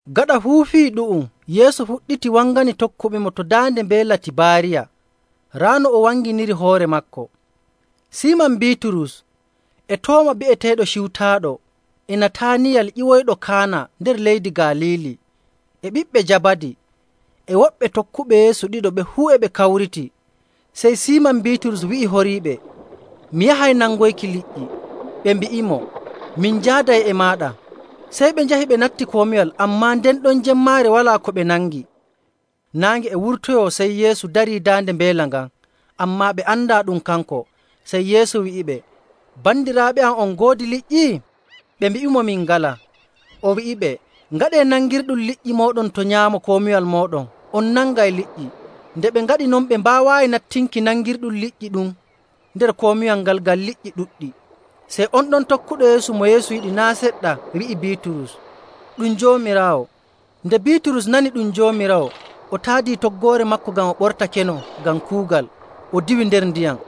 Gaɗa fuu fii ɗu'um Yeesu fuɗɗiti wangani tokkuɓemo to daande Mbeela Tibaariya. Raa no o wanginiri hoore maako. Siiman Biiturus, e Tooma bi'eteeɗo Ciwtaaɗo, e Nataaniyal ƴiwoyɗo Kaana nder leydi Galiili, e ɓiɓɓe Jabadi, e woɓɓe tokkuɓe Yeesu ɗiɗo ɓe fuu e ɓe kawriti. Sey Siiman Biiturus wi'i horiiɓe, “Mi yahay nangoyki liƴƴi.”. Ɓe mbi'imo, “Min njaaday e maaɗa.” Sey ɓe njahi ɓe natti komiwal, ammaa nden ɗon jemmaare walaa ko ɓe nangi. Naange e wurtoyoo, sey Yeesu darii daande mbeela ngan, ammaa ɓe andaa ɗum kanko. Sey Yeesu wi'iɓe, “Bandiraaɓe, on ngoodi liƴƴi?” Ɓe mbi'imo, “Min ngalaa.” O wi'iɓe, “Ngaɗee nangirɗum liƴƴi mooɗon to nyaamo komiwal mooɗon, on nangay liƴƴi.” Nde ɓe ngaɗi non, ɓe mbaawaayi nattinki nangirɗum liƴƴi ɗum nder komiwal ngal, ngam liƴƴi ɗuɗɗi.. Sey on ɗon tokkuɗo Yeesu mo Yeesu yiɗi naa' seɗɗa, wi'i Biiturus, “Ɗum Joomiraawo.” Nde Biiturus nani ɗum Joomiraawo, o taadii toggoore maako ngam o ɓortakeno ngam kuugal, o diwi nder ndiyam.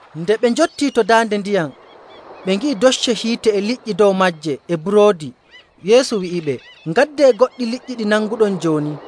Nde ɓe njottii to daande ndiyam, ɓe ngi'i docce hiite e liƴƴi dow maaje e buroodi. Yeesu wi'iɓe, “Ngaddee goɗɗi liƴƴi ɗi nanguɗon jooni.”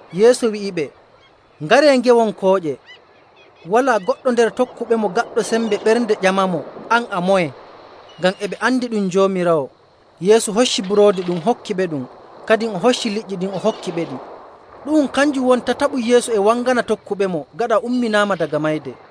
Yeesu wi'iɓe, “Ngaree, ngewon kooƴe.” Walaa goɗɗo nder tokkuɓemo gaɗɗo sembe ɓernde ƴamamo, “An a moye?” ngam e ɓe andi ɗum Joomiraawo. Yeesu hocci buroodi ɗum, hokkiɓeɗum, kadin o hocci liƴƴi ɗin, o hokkiɓeɗi. Ɗu'um kanjum woni tataɓum Yeesu e wangana tokkuɓemo gaɗa o umminaama daga mayde.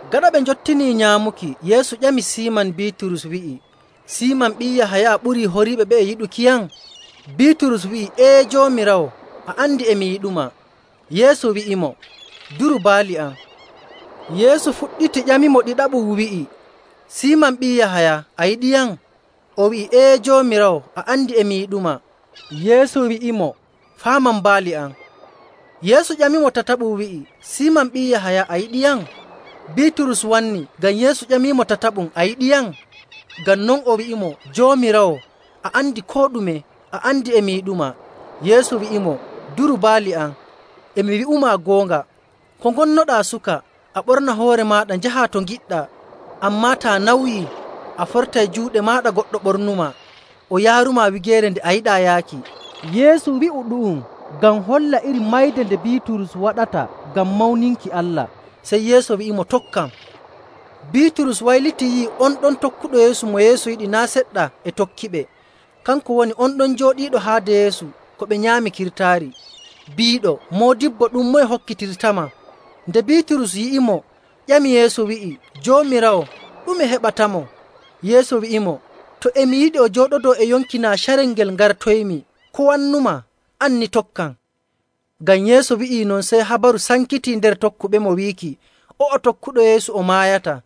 Gaɗa ɓe njottinii nyaamuki, Yeesu ƴami Siiman Biiturus wi'i, “Siiman ɓii Yahaya, a ɓurii horiiɓe ɓe'e yiɗukiyam?” Biiturus wi'i, “Ee, Joomiraawo, a andi e mi yiɗumaa.” Yeesu wi'imo, “Duru baali am.” Yeesu fuɗɗiti ƴamimo ɗiɗaɓum wi'i, “Siiman ɓii Yahaya, a yiɗiyam?” O wi'i, “Ee, Joomiraawo, a andi e mi yiɗumaa.” Yeesu wi'imo, “Faaman baali am.” Yeesu ƴamimo tataɓum wi'i, “Siiman, ɓii Yahaya, a yiɗiyam?” Biiturus wanni ngam Yeesu ƴamimo tataɓum, “A yiɗiyam?” Ngam non o wi'imo, “Joomiraawo, a andi koo ɗume. A andi e mi yiɗumaa.” Yeesu wi'imo, “Duru baali am. E mi wi'umaa goonga, ko ngonnoɗaa suka a ɓorna hoore maaɗa njahaa to ngiɗɗaa. Ammaa taa nawyii, a fortay juuɗe maaɗa goɗɗo ɓornumaa o yaarumaa wigeere nde a yiɗaa yaaki.” Yeesu wi'u ɗu'um ngam holla iri mayde nde Biiturus waɗata ngam mawninki Allah. Sey Yeesu wi'imo, “Tokkam.” Biiturus waylitii yi'i on ɗon tokkuɗo Yeesu mo Yeesu yiɗi naa' seɗɗa e tokkiɓe. Kanko woni on ɗon jooɗiiɗo haade Yeesu ko ɓe nyaami kirtaari, biiɗo, “Moodibbo, ɗum moye hokkitirtama?”. Nde Biiturus yi'imo, ƴami Yeesu wi'i, “Joomiraawo, ɗume heɓatamo?” Yeesu wi'imo, “To e mi yiɗi o jooɗodoo e yonki naa carel ngel ngartoymi, ko wannumaa? An ni, tokkam.” Ngam Yeesu wi'i non, sey habaru sankitii nder tokkuɓemo wiiki o'o tokkuɗo Yeesu o maayataa.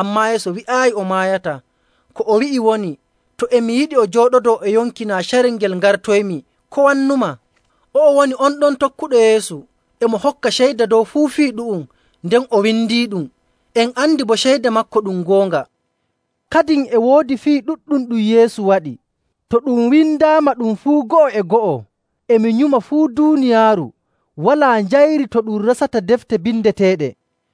Ammaa Yeesu wi'aayi o maayataa. Ko o wi'i woni, “To e mi yiɗi o jooɗodoo e yonki naa carel ngel ngartoymi, ko wannumaa?” O'o woni on ɗon tokkuɗo Yeesu e mo hokka ceyda dow fuu fii ɗu'um nden o windiiɗum. En andi boo ceyda maako ɗum goonga. Kadin e woodi fii ɗuɗɗum ɗum Yeesu waɗi. To ɗum windaama ɗum fuu go'o e go'o, e mi nyuma fuu duuniyaaru walaa njayri to ɗum resata defte bindeteeɗe.